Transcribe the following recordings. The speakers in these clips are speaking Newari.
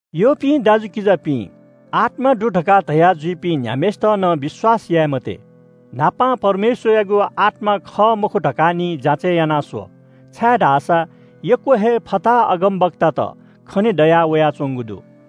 यःपिं दाजुकिजापिं, आत्‍मा दु धकाः धयाजुइपिं न्‍ह्याम्‍हय्‌सित नं विश्‍वास याये मते। न्‍हापां परमेश्‍वरयागु आत्‍मा खः मखु धकाः निं जाँचय् याना स्‍व, छाय्‌धाःसा यक्‍व हे फताहा अगमवक्तात खने दया वयाच्‍वंगु दु।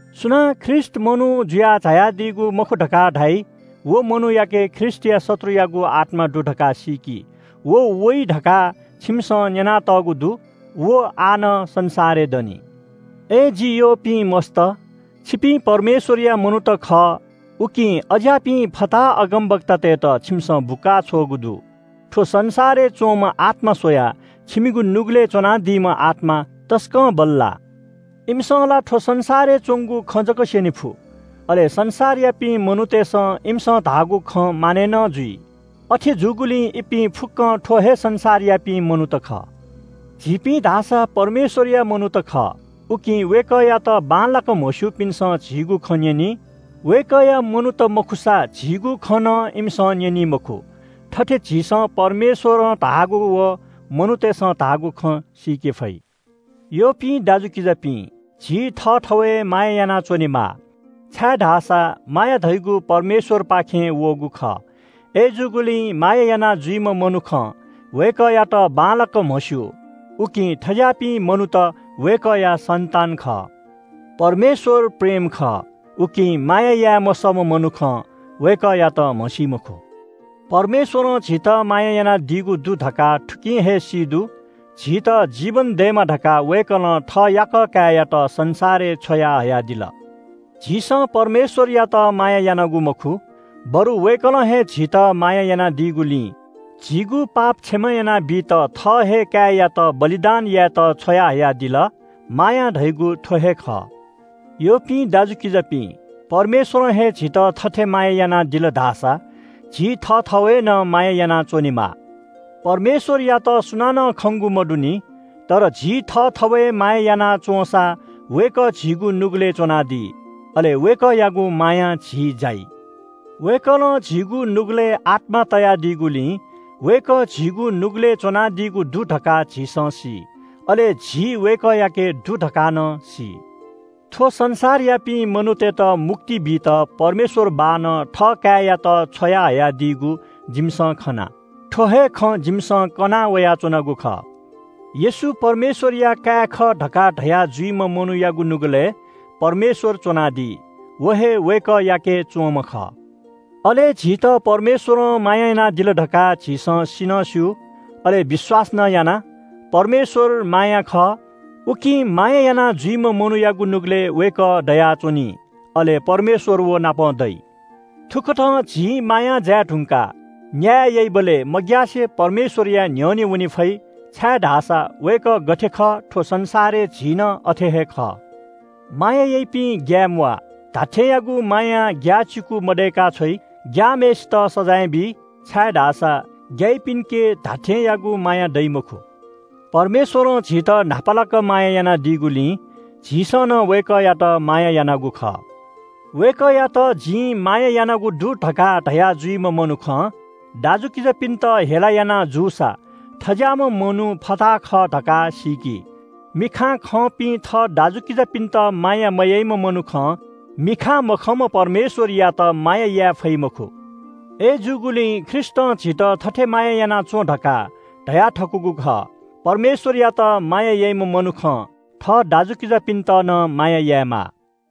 सुनां ख्रीष्‍ट मनू जुयाः झायादीगु मखु धकाः धाइ, व मनूयाके ख्रीष्‍टया शत्रुयागु आत्‍मा दु धकाः सीकि। व वइ धकाः छिमिसं न्‍यनातःगु दु। व आः नं संसारय् दनि। अय् जि यःपिं मस्‍त, छिपिं परमेश्‍वरया मनूत खः, उकिं अज्‍याःपिं फताहा अगमवक्तातय्‌त छिमिसं बुकाछ्वःगु दु। थ्‍व संसारय् च्‍वंम्‍ह आत्‍मा स्‍वयाः छिमिगु नुगलय् च्‍वनादीम्‍ह आत्‍मा तसकं बल्‍लाः। इमिसं ला थ्‍व संसारय् च्‍वंगु खँ जक स्‍यने फु। अले संसारयापिं मनूतय्‌सं इमिसं धाःगु खँ मानय् नं जुइ। अथे जूगुलिं इपिं फुक्‍कं थ्‍व हे संसारयापिं मनूत खः। झीपिं धाःसा परमेश्‍वरया मनूत खः, उकिं वय्‌कःयात बांलाक म्‍हस्‍यूपिन्‍सं झीगु खँ न्‍यनी। वय्‌कःया मनूत मखुसा झीगु खँ नं इमिसं न्‍यनी मखु। थथे झीसं परमेश्‍वरं धाःगु व मनूतय्‌सं धाःगु खँ सीके फइ। यःपिं दाजुकिजापिं, झी थःथवय् माया यानाच्‍वनेमाः, छाय्‌धाःसा माया धयागु परमेश्‍वरपाखें वःगु खः। अय्‌जूगुलिं माया यानाजुइम्‍ह मनुखं वय्‌कःयात बांलाक म्‍हस्‍यू, उकिं थज्‍याःपिं मनूत वय्‌कःया सन्‍तान खः। परमेश्‍वर प्रेम खः, उकिं माया याये मसःम्‍ह मनुखं वय्‌कःयात म्‍हसी मखु। परमेश्‍वरं झीत माया यानादीगु दु धकाः थुकिं हे सी दु – झीत जीवन दयेमा धकाः वय्‌कलं थः याकः काय्‌यात संसारय् छ्वयाहयादिल। झीसं परमेश्‍वरयात माया यानागु मखु, बरु वय्‌कलं हे झीत माया यानादीगुलिं झीगु पाप क्षमा यानाबीत थः हे काय्‌यात बलिदान यायेत छ्वयाहयादिल – माया धयागु थ्‍व हे खः। यःपिं दाजुकिजापिं, परमेश्‍वरं हे झीत थथे माया यानादिल धाःसा झी थःथवय् नं माया यानाच्‍वनेमाः। परमेश्‍वरयात सुनानं खंगु मदुनि। तर झी थःथवय् माया याना च्‍वंसा वय्‌कः झीगु नुगलय् च्‍वनादी। अले वय्‌कःयागु मायां झी जाइ। वय्‌कलं झीगु नुगलय् आत्‍मा तयादीगुलिं वय्‌कः झीगु नुगलय् च्‍वनादीगु दु धकाः झीसं सी। अले झी वय्‌कःयाके दु धकाः नं सी। थ्‍व संसारयापिं मनूतय्‌त मुक्ति बीत परमेश्‍वर बाःनं थःकाय्‌यात छ्वयाहयादीगु जिमिसं खना। थ्‍व हे खँ जिमिसं कनावयाच्‍वनागु खः। येशू परमेश्‍वरया काय् खः धकाः धया जुइम्‍ह मनूयागु नुगलय् परमेश्‍वर च्‍वनादी। व हे वय्‌कःयाके च्‍वंम्‍ह खः। अले झीत परमेश्‍वरं माया यानादिल धकाः झीसं सि नं स्‍यू, अले विश्‍वास नं याना। परमेश्‍वर माया खः, उकिं माया यानाजुइम्‍ह मनूयागु नुगलय् वय्‌कः दयाच्‍वनी। अले व नाप दइ। थुकथं झी मायां जाये धुंकाः न्‍याय याइबलय् मग्‍यासे परमेश्‍वरया न्‍ह्यःने वने फइ, छाय्‌धाःसा वय्‌कः गथे खः थ्‍व संसारय् झी नं अथे हे खः। माया याइपिं ग्‍याये म्‍वाः। धात्‍थेंयागु मायां ग्‍याःचिकु मदय्‌का छ्वइ। ग्‍याःम्‍हय्‌सित सजाँय बी, छाय्‌धाःसा ग्‍याइपिन्‍के धात्‍थेंयागु माया दइ मखु। परमेश्‍वरं झीत न्‍हापालाक माया यानादीगुलिं झीसं नं वय्‌कःयात माया यानागु खः। वय्‌कःयात जिं माया यानागु दु धकाः धया जुइम्‍ह मनुखं दाजुकिजापिन्‍त हेला याना जूसा थज्‍याःम्‍ह मनू फताहा खः धकाः सीकि। मिखां खंपिं थः दाजुकिजापिन्‍त माया मयाइम्‍ह मनुखं मिखां मखंम्‍ह परमेश्‍वरयात माया याये फइ मखु। अय्‌जूगुलिं ख्रीष्‍टं झीत थथे याना च्‍वँ धकाः धयाथकूगु खः – “परमेश्‍वरयात माया याइम्‍ह मनुखं थः दाजुकिजापिन्‍त नं माया यायेमाः।”